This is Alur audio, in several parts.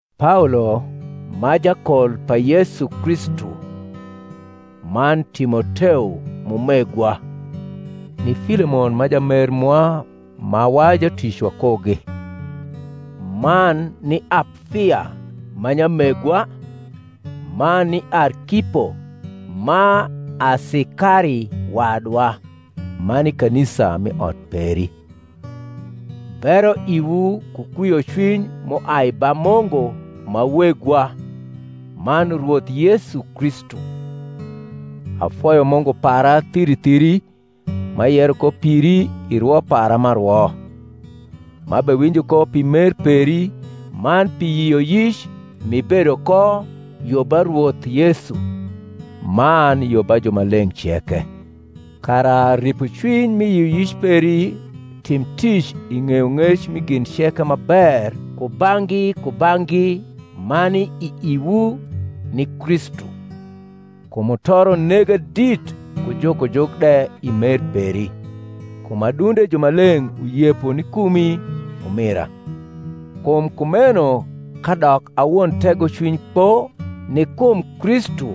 Paolo, ma jakol pa Yesu Kristu, man Timoteo m’umegwa, ni Filemon ma jamer mwa ma wa jutic wakugi, man ni Aplia ma nyamegwa, man ni Arkipo ma asikari wadwa, man ni kanisa m’i ot peri: Bero iwu ku kwiocwiny m’uai ba Mungu ma Wegwa man Rwoth Yesu Kristu. Afoyo Mungu para thiri thiri, m’ayero ko piri i rwo para m’arwo, m’abewinjo ko pi mer peri, man pi yioyic m’ibedo ko yo ba Rwoth Yesu, man yo ba jumaleng’ ceke; kara ripocwiny mi yioyic peri tim tic i ng’eyong’ec mi gin ceke ma ber kubang’gi kubang’gi ma ni i iwu, ni Kristu. Kum mutoro nega dit ku jukojuk de i mer peri, kum adunde jumaleng’ uyepo ni kumi, umira. Kum kumeno, kadok a won tegocwiny kpo ni kum Kristu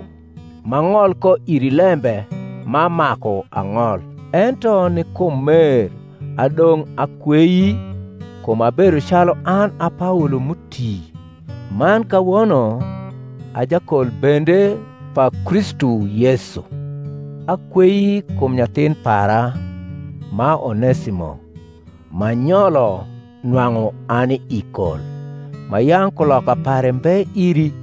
m’ang’ol ko iri lembe ma maku ang’ol, ento ni kum mer adong’ akwei, kum abedo calu an a Paolo m’uti, man kawono a jakol bende pa Kristu Yesu: akwei kum nyathin para, ma Onesimo, m’anyolo nwang’u ani i kol, ma yang’ kuloka pare mbe iri,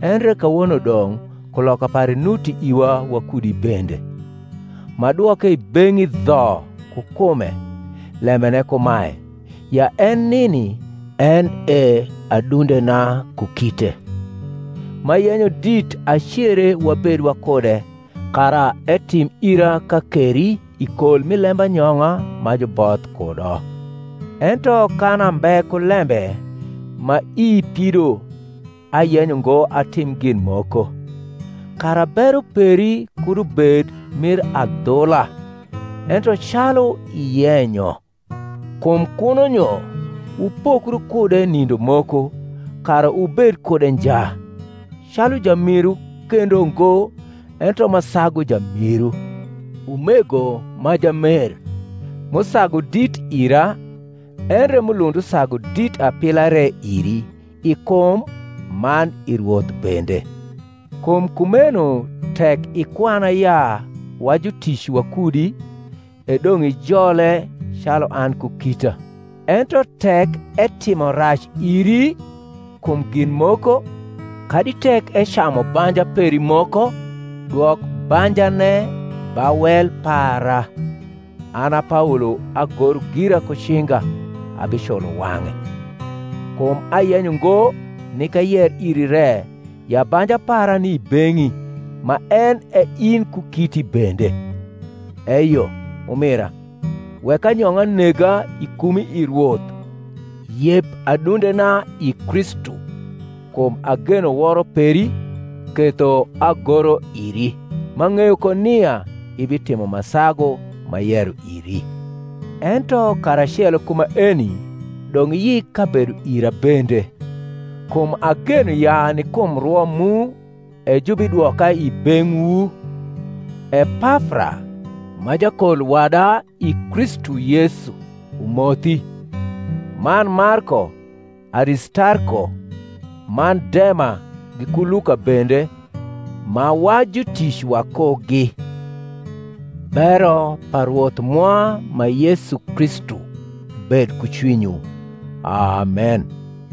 endre kawono dong’ kuloka pare nuti iwa wakudi bende: m’adwoke i beng’i dho ku kume, lembene kumae, ya en nini en e adundena ku kite: m’ayenyo dit acere wabed wakude, kara etim ira kakeri i kol mi lembanyong’a ma juboth kudo: ento kan ambe ku lembe ma ii pido ayenyo ngo atim gin moko; kara bero peri kud ubed mir adhula, ento calu iyenyo. Kum kuno nyo wupokru kude nindo moko, kara wubed kude nja; calu jamiru kendo ngo, ento ma sagu jamiru, umego ma jamer, m’usagu dit ira, endre m’ulund usagu dit apila re iri, i kum man i Rwoth bende. Kum kumeno tek ikwana ya wa jutic wakudi, e dong’ ijole calu an ku kita. Ento tek etimo rac iri kum gin moko, kadi tek ecamu banja peri moko, dwok banjane ba wel para; an a Paolo agoro gira ku cinga, abiculo wang’e: kum ayenyo ngo nik ayer iri re ya banja para ni i beng’i ma en e in ku kiti bende. Eyo, umira, wek anyong’a nega i kumi i Rwoth: yep adundena i Kristu. Kum ageno woro peri ketho agoro iri, m’ang’eyo ko nia ibitimo ma sagu m’ayero iri. Ento karacelo ku maeni doug’ iyik kabedo ira bende: kum ageno ya ni kum rwo mu e jubidwoka i beng’wu. Epafra, ma jakol wada i Kristu Y esu, umothi; man Marko, Aristarko, man Dema giku Luka bende, ma wa jutic wakugi. Bero pa Rwoth mwa ma Yesu Kristu bed ku cwinywu. Amen.